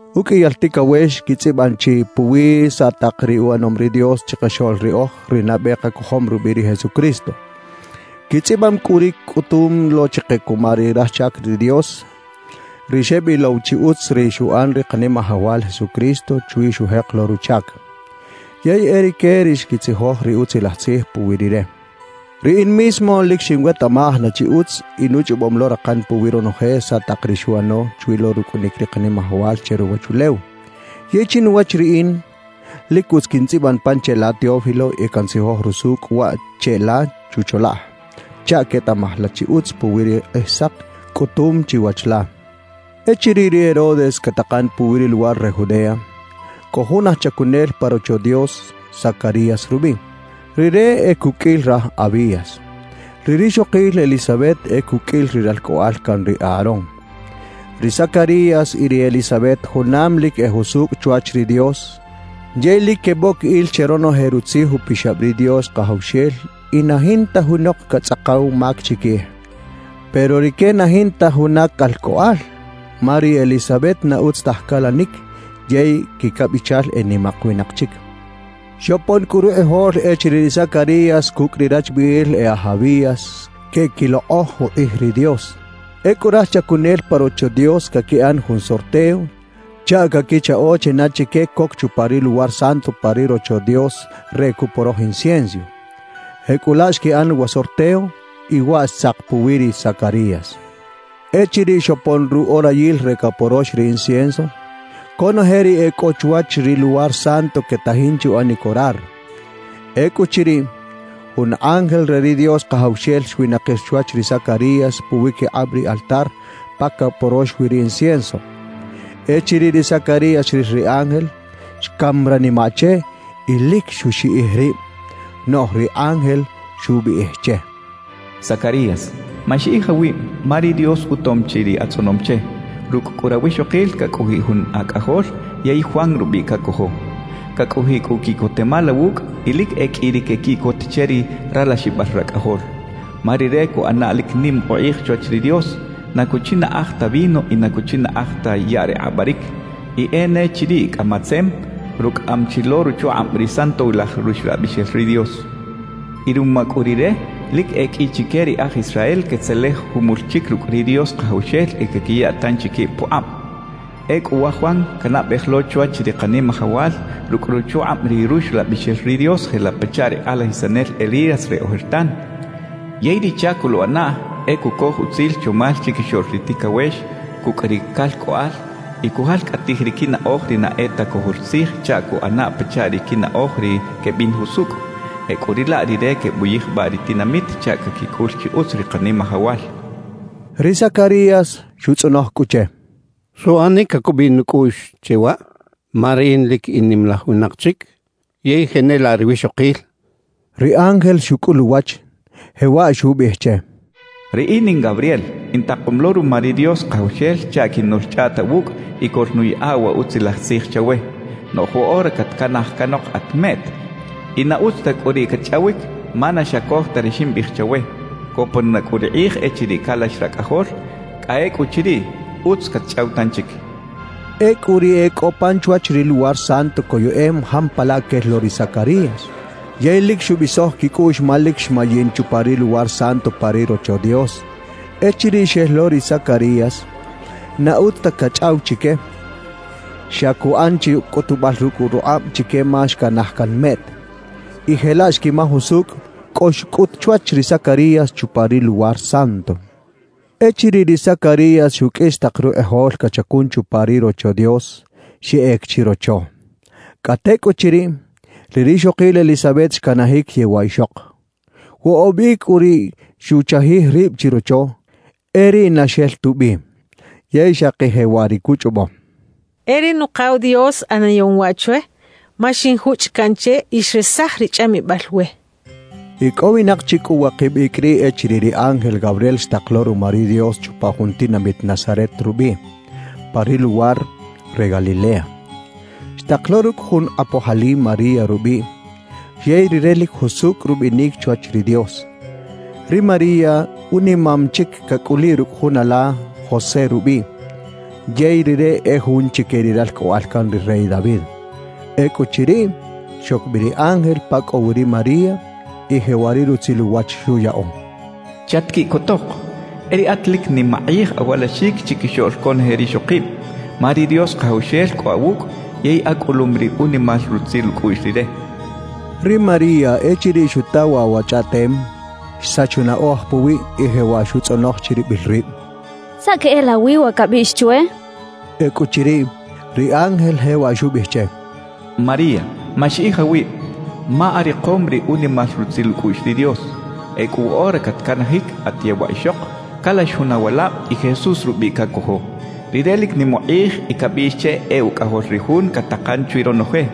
Ukꞌiyal tikawex kitzꞌibꞌam chi puwi saꞌ taq ri uꞌanom ri Dios chiqaxoꞌl riꞌoj, ri nabꞌe qakojom rubꞌiꞌ ri Jesucristo. Kitzꞌibꞌam kꞌu ri kꞌutum lo chiqe kuma ri raj chak ri Dios, ri xebꞌilow chi utz ri xuꞌan ri Qanimajawal Jesucristo chwi xujeq lo ruchak. Yey e rike ri xkitzijoj ri Utzilaj Tzij puwi Rire. Riꞌin mismo lik xinwetaꞌmaj na chi utz y nuchꞌobꞌom lo raqan puwi ronoje saꞌ taq ri xuꞌano chwi lo rukꞌunik ri Qanimajawal che ruwachulew. Yey chinuwach riꞌin, lik utz kintzꞌibꞌan pan cheꞌla Teófilo y kantzijoj rusukꞌ waꞌ cheꞌla chucholaꞌj chaꞌ ketaꞌmaj la chi utz puwi ri Qꞌijsaq kꞌutum chiwach la. Echiriꞌ ri Herodes kataqan puwi ri luwar re Judea, kꞌo jun aj chakunel pa Rocho Dios, Zacarías rubꞌiꞌ. Rire e kukꞌil raj Abías. Ri rixoqil Elizabet e kukꞌil ri ralkꞌoꞌal kan ri Aarón. Ri Zacarías y ri Elizabet junam lik e jusukꞌ chwach ri Dios, yey lik kebꞌok il che ronoje Rutzij Upixabꞌ ri Dios Qajawxel y na jinta junoq katzꞌaqaw mak chikij. Pero rike na jinta juna kalkꞌoꞌal, ma ri Elizabet na utz taj kalanik yey kikabꞌichal e nimaq winaq chik. Xopon kꞌu ruqꞌijol echiriꞌ ri Zacarías kukꞌ ri rachbꞌiꞌil e aj Abías keꞌkiloqꞌoj uqꞌij ri Dios. Ekꞌu raj chakunel pa Rocho Dios kakiꞌan jun sorteo chaꞌ kakichaꞌo china chike kok chupa ri Luwar Santo pa ri Rocho Dios re kuꞌporoj incienso. Jekꞌulaꞌ xkiꞌan wa sorteo, y waꞌ xtzaq puwi ri Zacarías. Echiriꞌ xopon ruꞌorayil re kaporox ri incienso, konoje ri ekꞌo chwach ri Luwar Santo ketajin che uꞌanik orar. Ekꞌuchiriꞌ, jun ángel re ri Dios Qajawxel xwinaqir chwach ri Zacarías puwikiqꞌabꞌ ri altar pa kaporox wi ri incienso. Echiriꞌ ri Zacarías xril ri ángel, xkam ranimaꞌ che y lik xuxiꞌij ribꞌ. Noꞌj ri ángel xubꞌiꞌij che: —Zacarías, maxiꞌij awibꞌ, ma ri Dios utom chi ri atzꞌonom che. Rukꞌ kꞌu rawixoqil kakꞌojiꞌ jun akꞌajol yey Juan rubꞌiꞌ kakojo. Kakꞌojiꞌ kꞌu kiꞌkotemal awukꞌ y lik e kꞌi ri kekiꞌkot che ri ralaxibꞌal rakꞌajol, ma rire kuꞌana lik nim uqꞌij chwach ri Dios. Na kuchinaꞌaj ta vino y na kuchinaꞌaj ta yaꞌ re qꞌabꞌarik; y e ne chiriꞌ kꞌa matzem, rukꞌaꞌam chi lo ruchuqꞌabꞌ ri Santowilaj Ruxlabꞌixel ri Dios. Y ruma kꞌu Rire, lik e kꞌi chike ri e aj Israel ketzelej jumul chik rukꞌ ri Dios Qajawxel y kakiya tanchi kibꞌ puqꞌabꞌ. Ekꞌu wa Juan kanabꞌej lo chwach ri Qanimajawal rukꞌ ruchuqꞌabꞌ ri Ruxlabꞌixel ri Dios jelaꞌ pachaꞌ ri qꞌalajisanel Elías re ojertan. Yey ri chak koluꞌanaꞌ e kukoj utzil chomal chikixoꞌl ri tikawex kukꞌ ri kalkꞌoꞌal y kujalkꞌatij ri kinaꞌoj ri na e ta kojol tzij chaꞌ kuꞌana pachaꞌ ri kinaꞌoj ri kebꞌin jusukꞌ. Jekꞌuriꞌlaꞌ rire kebꞌuyijbꞌaꞌ ri tinamit chaꞌ kakikꞌul chi utz ri Qanimajawal —xcha ri ángel. Ri Zacarías xutzꞌonoj kꞌu che: —¿Suꞌanik kakubꞌiꞌ nukꞌuꞌx che waꞌ? Ma riꞌin lik in nimalaj winaq chik yey jenelaꞌ ri wixoqil —xchaꞌ. Ri ángel xukꞌul uwach, jewaꞌ xubꞌiꞌij che: —Riꞌin in Gabriel, intaqom lo ruma ri Dios Qajawxel chaꞌ kinoꞌlchꞌaꞌt awukꞌ y koꞌlnuyaꞌa wa utzilaj tzij chawe. Noꞌj woꞌora katkanaj kanoq at meꞌt, y na utz ta kꞌu riꞌ katchꞌawik, ma na xakoj ta ri ximbꞌiꞌij chawe. Kopon na kꞌu ri qꞌij echiriꞌ kalax rakꞌajol; kꞌa ekꞌuchiriꞌ, utz katchꞌaw tanchik —xcha che. Ekꞌu ri e kꞌo pan chwach ri Luwar Santo koyeꞌem jampalaꞌ kel lo ri Zacarías, yey lik xubꞌisoj kikꞌuꞌx ma lik xmayin chupa ri Luwar Santo pa ri Rocho Dios. Echiriꞌ xel lo ri Zacarías, na utz ta kachꞌaw chike; xa kuꞌan chi kꞌutubꞌal rukꞌ ruqꞌabꞌ chike ma xkanaj kan meꞌt. Y jelaꞌ xkimaj usukꞌ kꞌo xkꞌut chwach ri Zacarías chupa ri Luwar Santo. Echiriꞌ ri Zacarías xukꞌis taq ruqꞌijol kachakun chupa ri Rocho Dios, xeꞌek chirocho. Kꞌa tekꞌuchiriꞌ, ri rixoqil Elizabet xkanajik yewaꞌ ixoq. Woꞌobꞌ ikꞌ kꞌu riꞌ xuchajij ribꞌ chirocho, e riꞌ na xel tubꞌi. Yey xaqi jewaꞌ ri kuchꞌobꞌo: «E ri Nuqaw Dios ꞌanayom waꞌ chwe ma xinjuchꞌ kaꞌn che y xresaj ri chꞌamibꞌal we.» Ikꞌowinaq chi kꞌu waqibꞌ ikꞌ riꞌ echiriꞌ ri ángel Gabriel xtaq lo ruma ri Dios chupa jun tinamit Nazaret rubꞌiꞌ, pa ri luwar re Galilea. Xtaq lo rukꞌ jun qꞌapoj ali María rubꞌiꞌ, yey rire lik jusukꞌ rubꞌinik chwach ri Dios. Ri María unimam chik kakꞌuliꞌ rukꞌ jun ala José rubꞌiꞌ, yey rire e jun chike ri ralkꞌoꞌal kan ri rey David. Ekꞌuchiriꞌ, xok bꞌi ri ángel pa kꞌo wi ri María, y jewaꞌ ri rutzil uwach xuyaꞌo: —¡Chatkiꞌkotoq! E riꞌat lik nim aqꞌij awalaxik chikixoꞌl konoje rixoqibꞌ. Ma ri Dios Qajawxel kꞌo awukꞌ yey akꞌulum ri unimal rutzil ukꞌuꞌx Rire —xcha che. Ri María echiriꞌ xuta waꞌ wa chꞌaꞌtem, xsach unaꞌoj puwiꞌ y jewaꞌ xutzꞌonoj chiribꞌil ribꞌ: “¿Saꞌ keꞌelawi wa kabꞌiꞌx chwe?” Ekꞌuchiriꞌ, ri ángel jewaꞌ xubꞌiꞌij che: —María, maxiꞌij awibꞌ, ma ariqom ri unimal rutzil ukꞌuꞌx ri Dios. Ekꞌu woꞌora katkanajik at yewaꞌ ixoq, kalax jun awalabꞌ y Jesús rubꞌiꞌ kakojo. Rire lik nim uqꞌij y kabꞌiꞌx che e Ukꞌajol ri Jun kataqan chwi ronoje.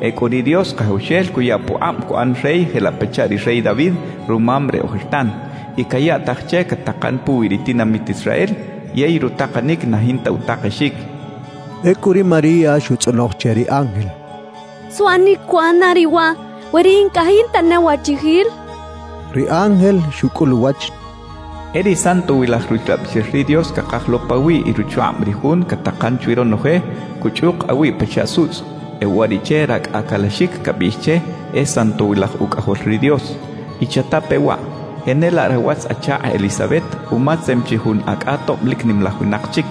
Ekꞌu ri Dios Qajawxel kuya puqꞌabꞌ kuꞌan rey jelaꞌ pachaꞌ ri rey David, rumam re ojertan. Y kayaꞌtaj che kataqan puwi ri tinamit Israel yey rutaqanik na jinta utaqexik —xcha che. Ekꞌu ri María xutzꞌonoj che ri ángel: —¿Suꞌanik kuꞌana riꞌ waꞌ, we riꞌin kꞌa jinta ne wachijil? —xchaꞌ. Ri ángel xukꞌul uwach: —E ri Santowilaj Ruxlabꞌixel ri Dios kaqaj lo pawiꞌ y ruchuqꞌabꞌ ri Jun kataqan chwi ronoje, kuchꞌuq awiꞌ pachaꞌ sutzꞌ. E uwariꞌche rakꞌa kalaxik kabꞌiꞌx che e Santowilaj Ukꞌajol ri Dios. Y chatape waꞌ, jenelaꞌ rawatz-achaqꞌ Elizabet umatzem chi jun akꞌa tobꞌ lik nimalaj winaq chik.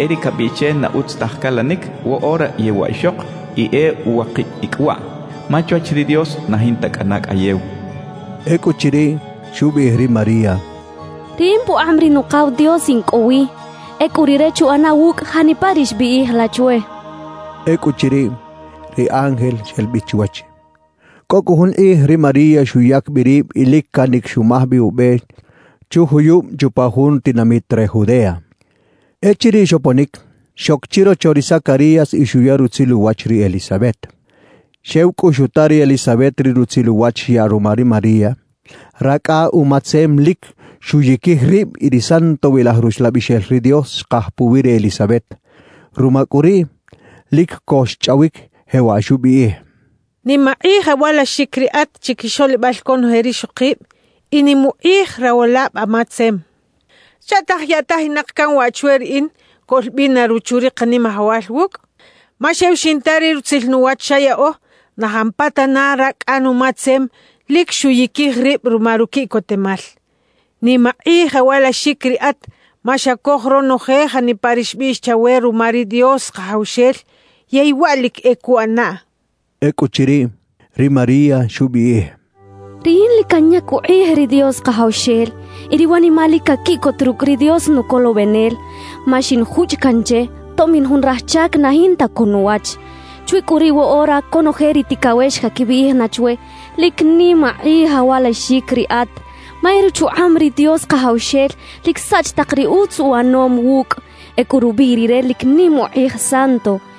E ri kabꞌiꞌx che na utz taj kalanik, woꞌora yewaꞌ ixoq y e uwaqibꞌ ikꞌ waꞌ. Ma chwach ri Dios na jinta kꞌana kꞌayew —xcha che. Ekꞌuchiriꞌ, xubꞌiꞌij ri María: —Riꞌin puqꞌabꞌ ri Nuqaw Dios in kꞌo wi. Ekꞌu Rire chuꞌana wukꞌ janipa ri xbꞌiꞌij la chwe —xchaꞌ. Ekꞌuchiriꞌ, ri ángel xel bꞌi chwach. Kꞌo kꞌu jun qꞌij ri María xuyak bꞌi ribꞌ y lik kanik xumaj bꞌi ubꞌe chujuyubꞌ chupa jun tinamit re Judea. Echiriꞌ xoponik, xok chirocho ri Zacarías y xuya rutzil uwach ri Elizabet. Xew kꞌu xuta ri Elizabet ri rutzil uwach xyaꞌ ruma ri María, rakꞌa umatzem lik xuyikij ribꞌ y ri Santowilaj Ruxlabꞌixel ri Dios xqaj puwi ri Elizabet. Ruma kꞌu riꞌ, lik ko xchꞌawik, jewaꞌ xubꞌiꞌij: —Nim aqꞌij awalaxik riꞌat chikixoꞌlibꞌal konoje rixoqibꞌ y nim uqꞌij rawalabꞌ amatzem. ¿Chaꞌtaj yaꞌtajinaq kan waꞌ chwe riꞌin koꞌlbꞌina ruchu ri Qanimajawal wukꞌ? Ma xew xinta ri rutzil nuwach xayaꞌo, na jampatana rakꞌa numatzem lik xuyikij ribꞌ ruma rukiꞌkotemal. Nim aqꞌij awalaxik riꞌat ma xakoj ronoje janipa ri xbꞌiꞌx chawe ruma ri Dios Qajawxel yey waꞌ lik e kuꞌanaꞌ —xchaꞌ. Ekꞌuchiriꞌ, ri María xubꞌiꞌij: «Riꞌin lik kanyak uqꞌij ri Dios Qajawxel, y ri wanimaꞌ lik kakiꞌkot rukꞌ ri Dios Nukolobꞌenel; ma xinjuchꞌ kaꞌn che, tobꞌ in jun raj chak na jinta ko nuwach. Chwi kꞌu riꞌ woꞌora konoje ri tikawex kakibꞌiꞌij na chwe: “Lik nim aqꞌij awalaxik riꞌat” ma e ruchuqꞌabꞌ ri Dios Qajawxel lik saꞌch taq ri utz uꞌanom wukꞌ. Ekꞌu rubꞌiꞌ Rire lik nim uqꞌij Santo.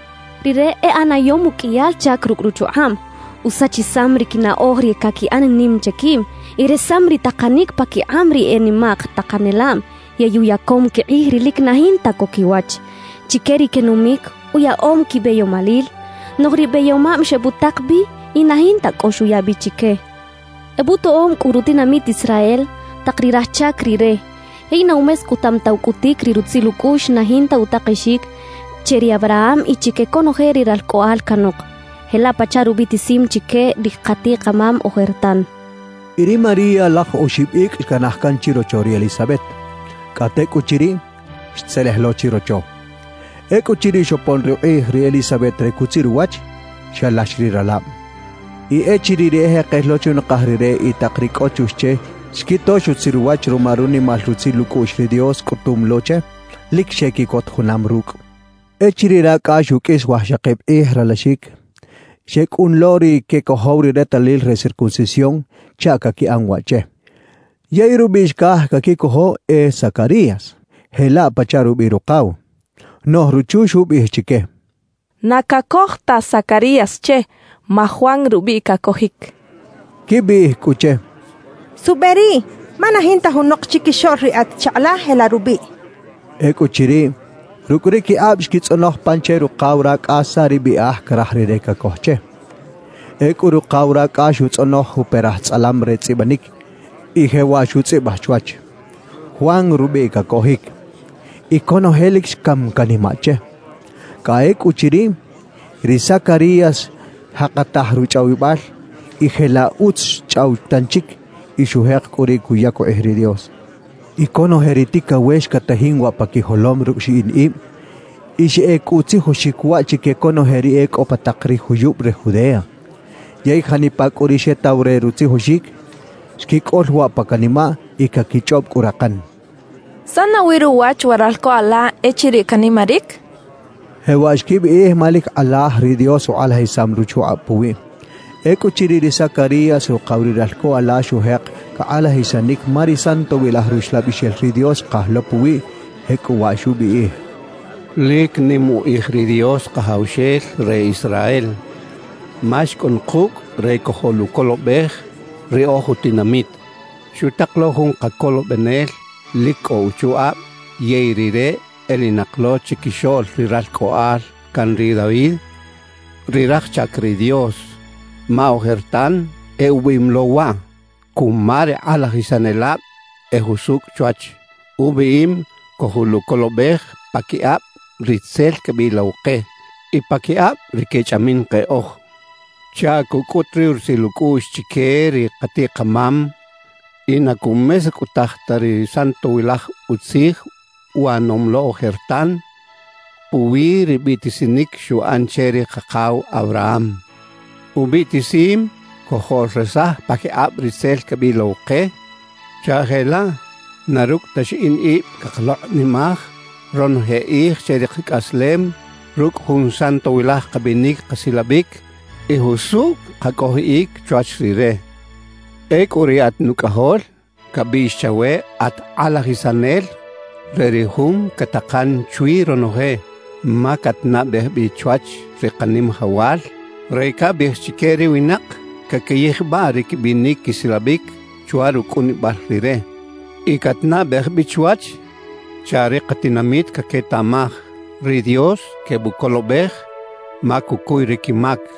Rire e ꞌanayom ukꞌiyal chak rukꞌ ruchuqꞌabꞌ. Usachisam ri kinaꞌoj ri kakiꞌan nim che kibꞌ, y resam ri taqanik pakiqꞌabꞌ ri e nimaq taqanelabꞌ; yey uyakom kiqꞌij ri lik na jinta ko kiwach. Chike ri kenumik, uyaꞌom kibꞌeyomalil; noꞌj ri bꞌeyomabꞌ xebꞌutaq bꞌi y na jinta kꞌo xuya bꞌi chike. Ebꞌutoꞌom kꞌu rutinamit Israel, taq ri raj chak Rire; yey na umeskꞌutam ta ukꞌutik ri rutzil ukꞌuꞌx na jinta utaqexik che ri Abraham y chike konoje ri ralkꞌoꞌal kanoq, jelaꞌ pachaꞌ rubꞌiꞌtisim chike ri qatiꞌ-qamam ojertan» xchaꞌ. Y ri María laj oxibꞌ ikꞌ xkanaj kan chirocho ri Elizabet. Kꞌa tekꞌuchiriꞌ, xtzelej lo chirocho. Ekꞌuchiriꞌ xopon ruqꞌij ri Elizabet re kutzir uwach, xalax ri ralabꞌ. Y echiriꞌ ri ejeqel lo chunaqaj rire y taq ri kꞌo chux che xkito xutzir uwach ruma runimal rutzil ukꞌuꞌx ri Dios kꞌutum lo che, lik xekiꞌkot junam rukꞌ. Echiriꞌ rakꞌa xukꞌis wajxaqibꞌ qꞌij ralaxik, xekꞌun lo ri kekojow ri retalil re circuncisión chaꞌ kakiꞌan waꞌ che. Yey rubꞌiꞌ xkaj kakikojo e Zacarías, jelaꞌ pachaꞌ rubꞌiꞌ ruqaw. Noꞌj ruchu xubꞌiꞌij chike: —Na kakoj ta Zacarías che, ma Juan rubꞌiꞌ kakojik —xchaꞌ. Xkibꞌiꞌij kꞌu che: —¿Suꞌbꞌe riꞌ? Ma na jinta junoq chikixoꞌl ri atz-chaqꞌ la jelaꞌ rubꞌiꞌ —xechaꞌ. Ekꞌuchiriꞌ, rukꞌ ri kiqꞌabꞌ xkitzꞌonoj pan che ruqaw rakꞌa saꞌ ri bꞌiꞌaj karaj rire kakoj che. Ekꞌu ruqaw rakꞌa xutzꞌonoj juperaj tzꞌalam re tzꞌibꞌanik y jewaꞌ xutzꞌibꞌaj chwach: «Juan rubꞌiꞌ kakojik.» Y konoje lik xkam kanimaꞌ che. Kꞌa ekꞌuchiriꞌ, ri Zacarías xjaqataj ruchꞌawibꞌal y jelaꞌ utz xchꞌaw tanchik. Y xujeq kꞌu riꞌ kuyak uqꞌij ri Dios. Y konoje ri tikawex katajin waꞌ pa kijolom rukꞌ xiꞌin ibꞌ, y xeꞌek kꞌu utzijoxik waꞌ chike konoje ri e kꞌo pa taq ri juyubꞌ re Judea. Yey janipa kꞌu ri xetaw re rutzijoxik, xkikꞌol waꞌ pa kanimaꞌ y kakichꞌobꞌ kꞌu raqan: «¿Saꞌ nawi ruwach wa ralko ala echiriꞌ kanimarik?» kechaꞌ. Jewaꞌ xkibꞌiꞌij ma lik qꞌalaj ri Dios uqꞌalajisam ruchuqꞌabꞌ puwiꞌ. Ekꞌuchiriꞌ, ri Zacarías ruqaw ri ralko ala xujeq kaqꞌalajisanik ma ri Santowilaj Ruxlabꞌixel ri Dios xqaj lo puwiꞌ; jekꞌuwaꞌ xubꞌiꞌij: «Lik nim uqꞌij ri Dios Qajawxel re Israel ma xkꞌun qukꞌ re kojoꞌlukolobꞌej ri oj utinamit. Xutaq lo jun Qakolobꞌenel lik kꞌo uchuqꞌabꞌ yey Rire elinaq lo chikixoꞌl ri ralkꞌoꞌal kan ri David, ri raj chak ri Dios. Ma ojertan e ubꞌiꞌim lo waꞌ kuma ri qꞌalajisanelabꞌ e jusukꞌ chwach. Ubꞌiꞌim kojoꞌlukolobꞌej pakiqꞌabꞌ ri tzel kebꞌilow qe y pakiqꞌabꞌ ri kechꞌamin qeꞌoj chaꞌ kukꞌut ri rutzil ukꞌuꞌx chike ri qatiꞌ-qamam y na kumeskꞌutaj ta ri santowilaj utzij uꞌanom lo ojertan puwi ri bꞌiꞌtisinik xuꞌan che ri qaqaw Abraham. Ubꞌiꞌtisim kojoꞌlresaj pakiqꞌabꞌ ri tzel kebꞌilow qe chaꞌ jelaꞌ na rukꞌ ta xiꞌin ibꞌ kaqaloqꞌnimaj ronoje qꞌij che ri qakꞌaslem rukꞌ jun santowilaj qabꞌinik qasilabꞌik y jusukꞌ qakꞌojiꞌik chwach Rire. Ekꞌu riꞌat nukꞌajol, kabꞌiꞌx chawe at qꞌalajisanel re ri Jun kataqan chwi ronoje; ma katnabꞌej bꞌi chwach ri Qanimajawal re kabꞌiꞌij chike ri winaq kakiyijbꞌaꞌ ri kibꞌinik kisilabꞌik chwa rukꞌunibꞌal Rire. Y katnabꞌej bꞌi chwach chaꞌ ri qatinamit kaketaꞌmaj ri Dios kebꞌukolobꞌej ma kukuy ri kimak.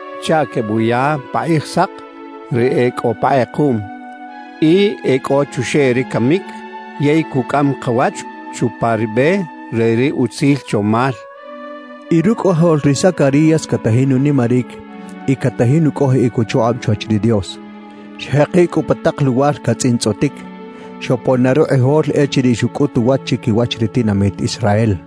chaꞌ kebꞌuya pa qꞌijsaq ri e kꞌo pa qꞌequꞌm y e kꞌo chuxeꞌ ri kamik, yey kukꞌam qawach chupa ri bꞌe re ri utzil chomal» xchaꞌ. Y rukꞌajol ri Zacarías katajin unimarik y katajin ukꞌojiꞌik uchuqꞌabꞌ chwach ri Dios. Xjeqiꞌ kꞌu pa taq luwar katzꞌintzꞌotik, xopon na ruqꞌijol echiriꞌ xukꞌut uwach chikiwach ri tinamit Israel.